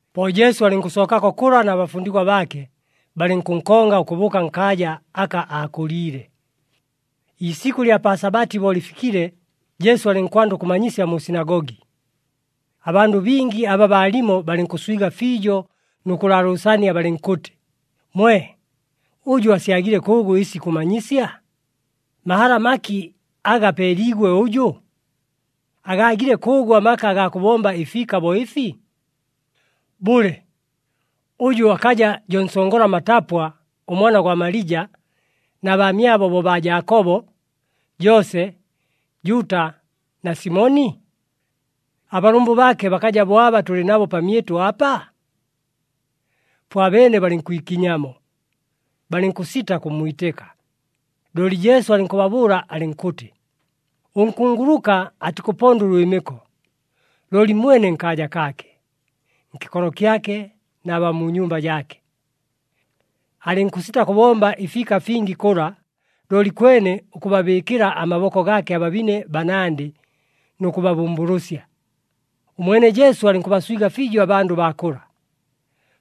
Po Jesu alɨnkʉsookako kʉla na bafundigwa baake, balɨnkʉnkonga ʉkʉbʉʉka nkaaja aka aakʉliile. Iisikʉ ɨlya pa Sabati bo lɨfikile, Jesu alɨnkwanda ʉkʉmanyisya mu sinagogi. Abandʉ bingi aba baalimo balɨnkʉswiga fiijo nʉ kʉlaalʉʉsania, balɨnkʉtɨ, “Mwe! Ʉjʉ asyagile kʉʉgʉ ɨsi ikʉmanyisya? Mahala maki aga apeeliigwe ʉjʉ? Agaagile kʉʉgʉ amaka agaa kʉbomba ɨfiika bo ɨfi? Bʉle, ʉjʉ akaja jo nsongola matapwa, ʉmwana gwa Malija, na baamyabo bo baa Jaakobo, Joose, Juuta na Simoni? Abalʉmbʉ baake bakaja bo aba tʉlɨ nabo pamyɨtʉ apa?” Po abeene balɨnkwikinyamo, balɨnkʉsita kʉmmwitɨka. Looli Jesu alɨnkʉbabʉʉla alɨnkʉtɨ, “Ʉnkunguluka atikʉpondwa ʉlwɨmɨko, looli mwene nkaaja kaake, nkɨkolo kyake na baa mu nyumba jaake.” Alɨnkʉsita kʉbomba ɨfiika fingi kʉla, looli kwene ʉkʉbabɨɨkɨla amaboko gaake ababine banandɨ nʉ kʉbabʉmbʉlʉsya. Ʉmwene Jesu alɨnkʉbaswiga fiijo abandʉ baa kʉla,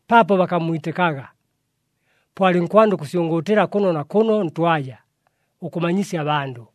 paapo bakammwitɨkaga. Po alɨnkwanda ʉkʉsyʉngʉʉtɨla kʉno na kʉno ntwaja, ʉkʉmanyisya abandʉ.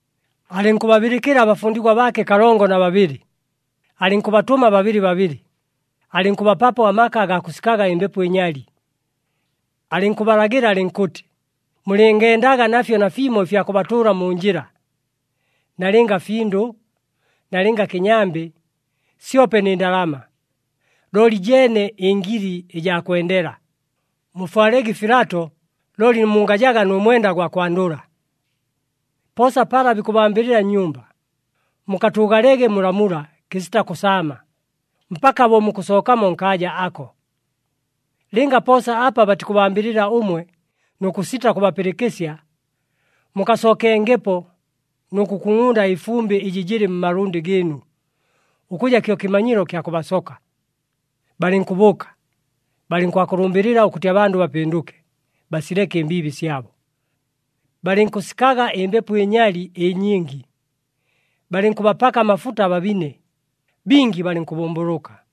Alɨnkʉbabɨlɨkɨla abafundigwa baake kalongo na babɨlɨ, alɨnkʉbatʉma babɨlɨ babɨlɨ, alɨnkʉbapapo amaka agaa kʉsikaga ɨmbepo ɨnyali. Alɨnkʉbalagɨla alɨnkʉtɨ, “Mulɨngendaga nafyo nafimo ɨfya kʉbatʉʉla mu njɨla, nalɨnga findʉ, nalɨnga kɨnyambɨ, syope nɨ ndalama, looli jeene ɨngili ɨjaa kwendela. Mufwalege ɨfilato, looli mungajaga nʉ mwenda gwa kwandʉla. Poosa pala bikʉbambɨlɨla nnyumba, mukatʉʉgalege mulamula kɨsita kʉsaama, mpaka bo mukʉsookamo nkaaja ako. Lɨnga poosa apa batikʉbambɨlɨla ʉmwe nʉ kʉsita kʉbapɨlɨkɨsya, mukasookengepo nʉ kʉkungʼunda ɨfumbɨ ɨjɨ jɨlɨ mmalʉndɨ gɨɨnu, ʉkʉja kyo kɨmanyilo kya kʉbasoka.” Balɨnkʉbʉʉka, balɨnkwakʉlʉmbɨlɨla ʉkʉtɨ abandʉ bapɨndʉke, basileke ɨmbiibi syabo. Balɨnkʉsikaga ɨmbepo ɨnyali ɨnyingi, balɨnkʉbapaka amafuta ababine, bingi balɨnkʉbʉmbʉlʉka.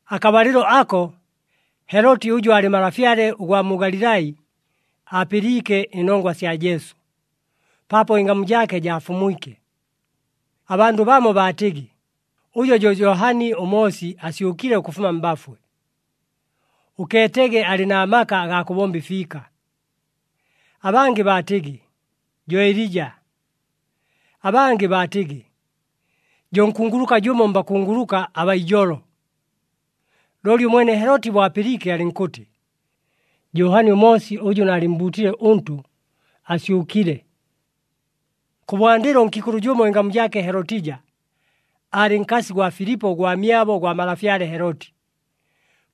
Akabalɨlo ako, Heloti ʉjʉ aalɨ malafyale ʉgwa mu Galilai, aapɨliike ɨnongwa sya Jesu, paapo ɨngamu jaake jaafumwike. Abandʉ bamo baatɨgɨ, “Ʉjo jo Johani ʉMoosi asyʉkile ʉkʉfuma mbafwe. Ʉkeetege alɨ na maka agaa kʉbomba ɨfiika.” Abangɨ baatɨgɨ, “Jo Elija.” Abangɨ baatɨgɨ, “Jo nkunguluka jʉmo mbakunguluka abaa ijolo.” Looli ʉmwene Heloti bo apɨliike, alɨnkʉtɨ, “Johani ʉMoosi, ʉjʉ naalɨmmbuutile ʉntʉ, asyʉkile.” Kʉbwandɨlo ʉnkiikʉlʉ jʉmo ɨngamu jaake Helotija, aalɨ nkasi gwa Filipo ʉgwamyabo gwa malafyale Heloti.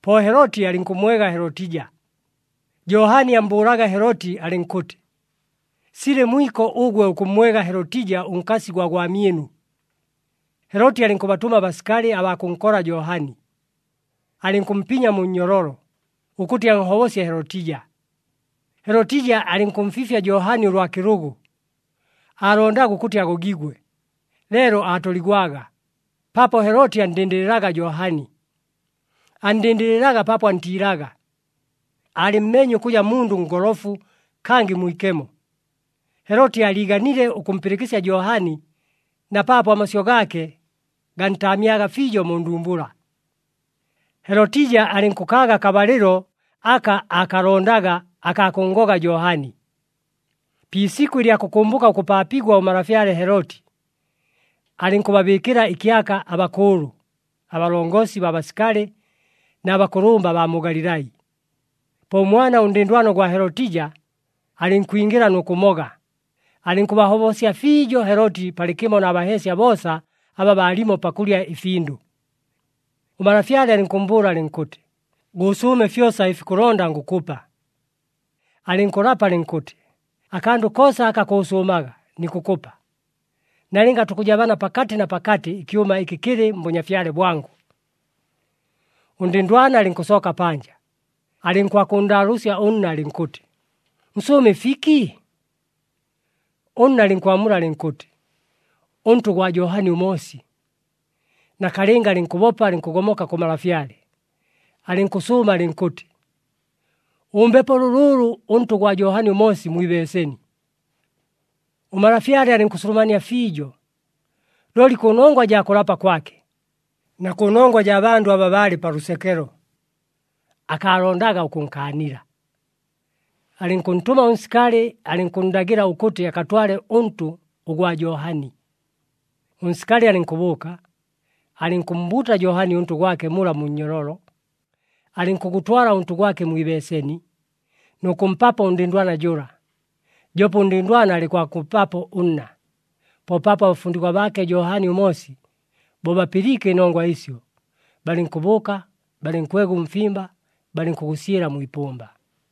Po Heloti alɨnkʉmmwega Helotija. Johani ammbʉʉlaga Heloti alɨnkʉtɨ, “Silɨ mwiko ʉgwe ʉkʉmmwega Helotija ʉnkasi gwa gwamyɨnu.” Heloti alɨnkʉbatʉma abasikali abaa kʉnkola Johani, alɨnkʉmpinya mu nnyololo, ʉkʉtɨ anhobosye Helotija. Helotija alɨnkʉmfiifya Johani ʉlwa kɨlʉgʉ, aalondaga ʉkʉtɨ agogigwe, leelo aatoligwaga, paapo Heloti anndɨndɨlɨlaga Johani. Anndɨndɨlɨlaga paapo antiilaga, aalɨmmeenye ʉkʉja mundʉ ngolofu kangɨ mwikemo. Heloti aaliiganile ʉkʉmpɨlɨkɨsya Johani na paapo amasyʉ gaake gantaamyaga fiijo mu ndumbula. Helotija alɨnkʉkaaga akabalɨlo aka aakalondaga akaa kʉnngoga Johani. Pi isikʉ ɨlya kʉkʉmbʉka ʉkʉpaapigwa ʉmalafyale Heloti, alɨnkʉbabɨɨkɨla ɨkyaka abakʉʉlʉ, abalongosi baa basikali na bakʉlʉmba abaa mu Galilai. Po ʉmwana ʉndɨndwana ʉgwa Helotija alɨnkwingɨla nʉ kʉmoga, alɨnkʉbahobosya fiijo Heloti palɨkɨmo na baheesya boosa aba baalimo pakʉlya ɨfindʉ. Ʉmalafyale alɨnkʉmmbʉʉla alɨnkʉtɨ, “Gʉʉsʉʉme fyosa ɨfi kʉlonda, ngʉkʉpa.” Alɨnkʉlapa alɨnkʉtɨ, “Akandʉ koosa aka kʉʉsʉʉmaga nikʉkʉpa, nalɨnga tukʉjabana pakatɨ na pakatɨ ɨkyʉma ɨkɨ kɨlɨ mbʉnyafyale bwangʉ.” Ʉndɨndwana alɨnkʉsooka panja, alɨnkwakʉnndaalʉʉsya ʉnna, alɨnkʉtɨ, “Nsʉʉme ɨfiki?” Ʉnna alɨnkwamula alɨnkʉtɨ, “Ʉntʉ ʉgwa Johani ʉMoosi.” Nakalɨnga alɨnkʉbopa alɨnkʉgomoka kʉ malafyale, alɨnkʉsʉʉma alɨnkʉtɨ, “Ʉmbepo lʉlʉʉlʉ ʉntʉ ʉgwa Johani ʉMoosi mwi ibeeseni.” Ʉmalafyale alɨnkʉsulumania fiijo, looli kʉnongwa jaa kʉlapa kwake, na kʉnongwa jaa bandʉ aba baalɨ pa lʉsekelo, akaalondaga ʉkʉnkaanila. Alɨnkʉntʉma ʉnsikali, alɨnkʉnndagɨla ʉkʉtɨ akatwale ʉntʉ ʉgwa Johani. Ʉnsikali alɨnkʉbʉʉka, alɨnkʉmmbuuta Johani ʉntʉ gwake mula mu nnyololo. Alɨnkʉgʉtwala ʉntʉ gwake mwi ibeeseni, nʉ kʉmpapo ʉndɨndwana jʉla, joope ʉndɨndwana alɨnkwakʉmpapo ʉnna. Po paapo abafundigwa baake Johani ʉMoosi, bo bapɨliike ɨnongwa ɨsyo, balɨnkʉbʉʉka, balɨnkwega ʉmfimba, balɨnkʉgʉsyɨla mwi ipʉmba.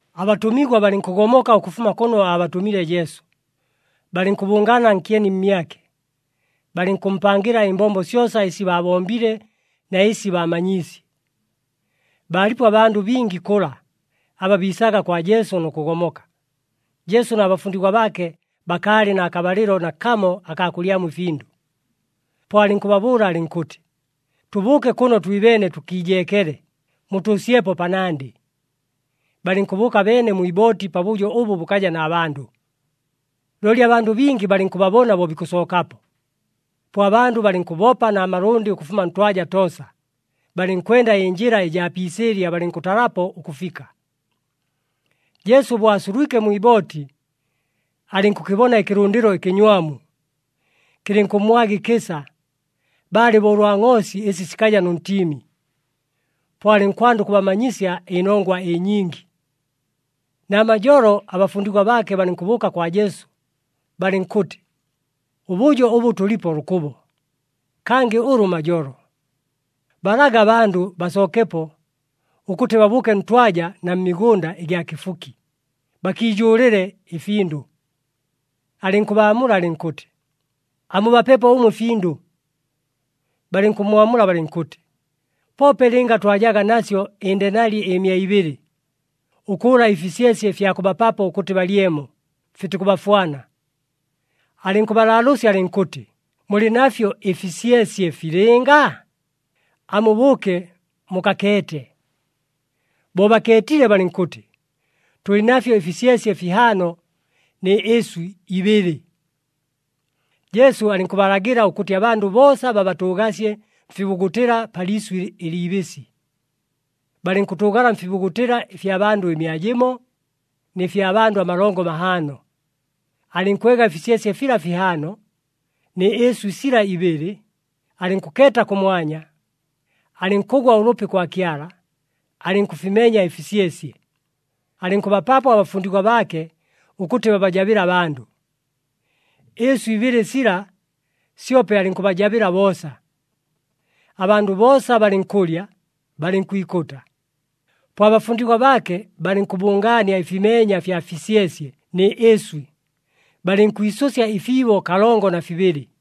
Abatʉmigwa balɨnkʉgomoka ʉkʉfuma kʉno aabatʉmile Jesu, balɨnkʉbʉngaana nkyeni mmyake, balɨnkʉmpangɨla ɨmbombo syosa ɨsi baabombile na ɨsi baamanyiisye. Baalipo abandʉ bingi kʉla, aba biisaga kwa Jesu nʉ kʉgomoka, Jesu na bafundigwa baake bakaalɨ na kabalɨlo nakamo akaa kʉlyamo ɨfindʉ. Po alɨnkʉbabʉʉla alɨnkʉtɨ, “Tʉbʉʉke kʉno twibeene tʉkiijeekele, mutʉʉsyepo panandɨ.” Balɨnkʉbʉʉka beene mwi ibooti pabʉjo ʉbʉ bʉkaja na bandʉ. Looli abandʉ bingi balɨnkʉbabona bo bikʉsookapo. Po abandʉ balɨnkʉbopa na malʉndɨ ʉkʉfuma ntwaja toosa, balɨnkwenda ɨnjɨla ɨjaa pi isɨɨlya, balɨnkʉtalapo ʉkʉfika. Jesu bo asulwike mwi ibooti, alɨnkʉkɨbona ɨkɨlʉndɨlo ɨkɨnywamu, kɨlɨnkʉmmwaga ɨkɨsa, baalɨ bo ʉlwa ngʼoosi ɨsi sikaja nʉ ntiimi. Po alɨnkwanda ʉkʉbamanyisya ɨnongwa ɨnyingi. Namajolo, abafundigwa baake balɨnkʉbʉʉka kwa Jesu, balɨnkʉtɨ, “Ʉbʉjo ʉbʉ tʉlipo lʉkʉbo, kangɨ ʉlʉ majolo. Balage abandʉ basookepo, ʉkʉtɨ babʉʉke ntwaja na mmigʉnda ɨgya kɨfuki, bakiijʉʉlɨle ɨfindʉ.” Alɨnkʉbaamula alɨnkʉtɨ, “Amubapepo ʉmwe ɨfindʉ.” Balɨnkʉmmwamula balɨnkʉtɨ, “Poope lɨnga twajaga nasyo ɨndenali ɨmia ibɨlɨ, ʉkʉʉla ɨfisyesye fya kʉbapapo ʉkʉtɨ balyemo, fitikʉbafwana.” Alɨnkʉbalaalʉʉsya alɨnkʉtɨ, “Mulɨ nafyo ɨfisyesye filɨnga? Amubʉʉke mukakeete.” Bo bakeetile, balɨnkʉtɨ, “Tʉlɨ nafyo ɨfisyesye fihaano nɨ ɨswɨ ibɨlɨ.” Jesu alɨnkʉbalagɨla ʉkʉtɨ abandʉ boosa babatʉʉgasye mfibugutɨla pa liisʉ ɨliibɨsɨ. Balɨnkʉtʉʉgala mfibugutɨla ɨfya bandʉ ɨmia jɨmo nɨ fya bandʉ amalongo mahaano. Alɨnkwega ɨfisyesye fila fihaano, nɨ ɨswɨ sila ibɨlɨ, alɨnkʉkeeta kʉmwanya, alɨnkʉgwa ʉlʉpi kwa Kyala, alɨnkʉfimenya ɨfisyesye, alɨnkʉbapapo abafundigwa baake ʉkʉtɨ babajabɨle abandʉ. Ɨɨswɨ ibɨlɨ sila, syope alɨnkʉbajabɨla boosa. Abandʉ boosa balɨnkʉlya, balɨnkwikʉta. Po abafundigwa baake balɨnkʉbʉngaania ɨfimeenya fya fisyesye nɨ ɨswɨ, balɨnkwisʉsya ɨfiibo kalongo na fibɨlɨ.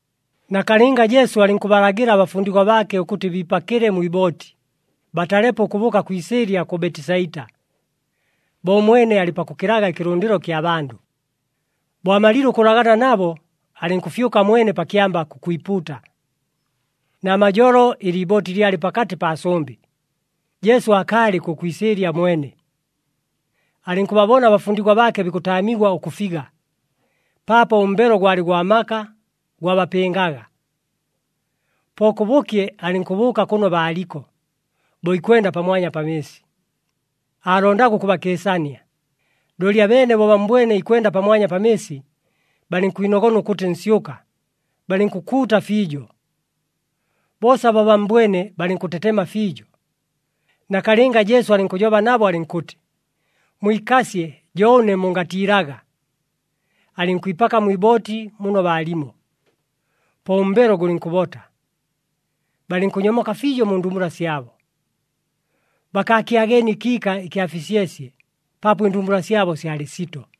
Nakalɨnga Jesu alɨnkʉbalagɨla abafundigwa baake ʉkʉtɨ biipakɨle mwi ibooti, batalepo ʉkʉbʉʉka kwi isɨɨlya kʉ Betisaita, bo ʉmwene alɨ pakʉkɨlaga ɨkɨlʉndɨlo kya bandʉ. Bo amalile ʉkʉlagana nabo, alɨnkʉfyʉka mwene pa kyamba kʉkwipuuta. Namajolo, ɨliibooti lyalɨ pakatɨ paa sʉmbɨ, Jesu aakaalɨ kʉ kwi isɨɨlya mwene. Alɨnkʉbabona abafundigwa baake bikʉtaamigwa ʉkʉfiga, paapo ʉmbelo gwalɨ gwa maka, gwabapɨngaga. Po kʉbʉkye alɨnkʉbʉʉka kʉno baaliko, bo ikwenda pamwanya pa mɨɨsi. Aalondaga ʉkʉbakɨɨsania, looli abeene bo bammbwene ikwenda pamwanya pa mɨɨsi, balɨnkwinogona ʉkʉtɨ nsyʉka, balɨnkʉkuuta fiijo. Boosa bo bammbwene balɨnkʉtetema fiijo. Nakalɨnga Jesu alɨnkʉjoba nabo, alɨnkʉtɨ, “Mwikasye, jo ʉne! Mungatiilaga!” Alɨnkwipaka mwi ibooti muno baalimo, po ʉmbelo gʉlɨnkʉbota. Balɨnkʉnyomoka fiijo mu ndumbula syabo. Bakaakyageenie ɨkiika ɨkya fisyesye, paapo ɨndumbula syabo syalɨ sito.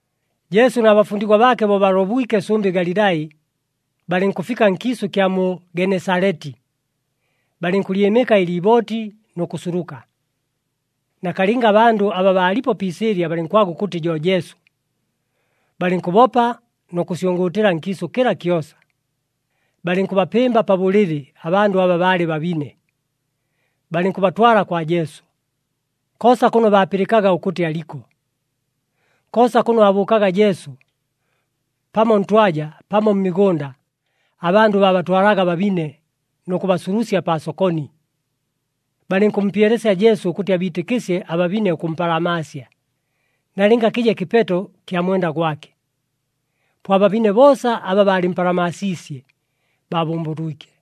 Jesu na bafundigwa baake bo balobwike sʉmbɨ Galilai, balɨnkʉfika nkiisʉ ɨkya mu Genesaleti, balɨnkʉlyɨmɨka ɨliibooti nʉ kʉsuluka. Nakalɨnga abandʉ aba baalipo pi isɨɨlya balɨnkwaga ʉkʉtɨ jo Jesu. Balɨnkʉbopa nʉ kʉsyʉngʉʉtɨla nkiisʉ kɨla kyosa, balɨnkʉbapɨmba pa bʉlɨlɨ abandʉ aba baalɨ babine, balɨnkʉbatwala kwa Jesu, koosa kʉno baapɨlɨkaga ʉkʉtɨ aliko. Koosa kʉno aabʉʉkaga Jesu, pamo ntwaja, pamo mmigʉnda, abandʉ baabatwalaga ababine nʉ kʉbasulusya paa sokoni. Balɨnkʉmpyelesya Jesu ʉkʉtɨ abiitɨkɨsye ababine ʉkʉmpalamaasya, nalɨnga kɨje kɨpeto kya mwenda gwake. Po ababine boosa aba baalɨmpalamaasiisye, baabʉmbʉlwike.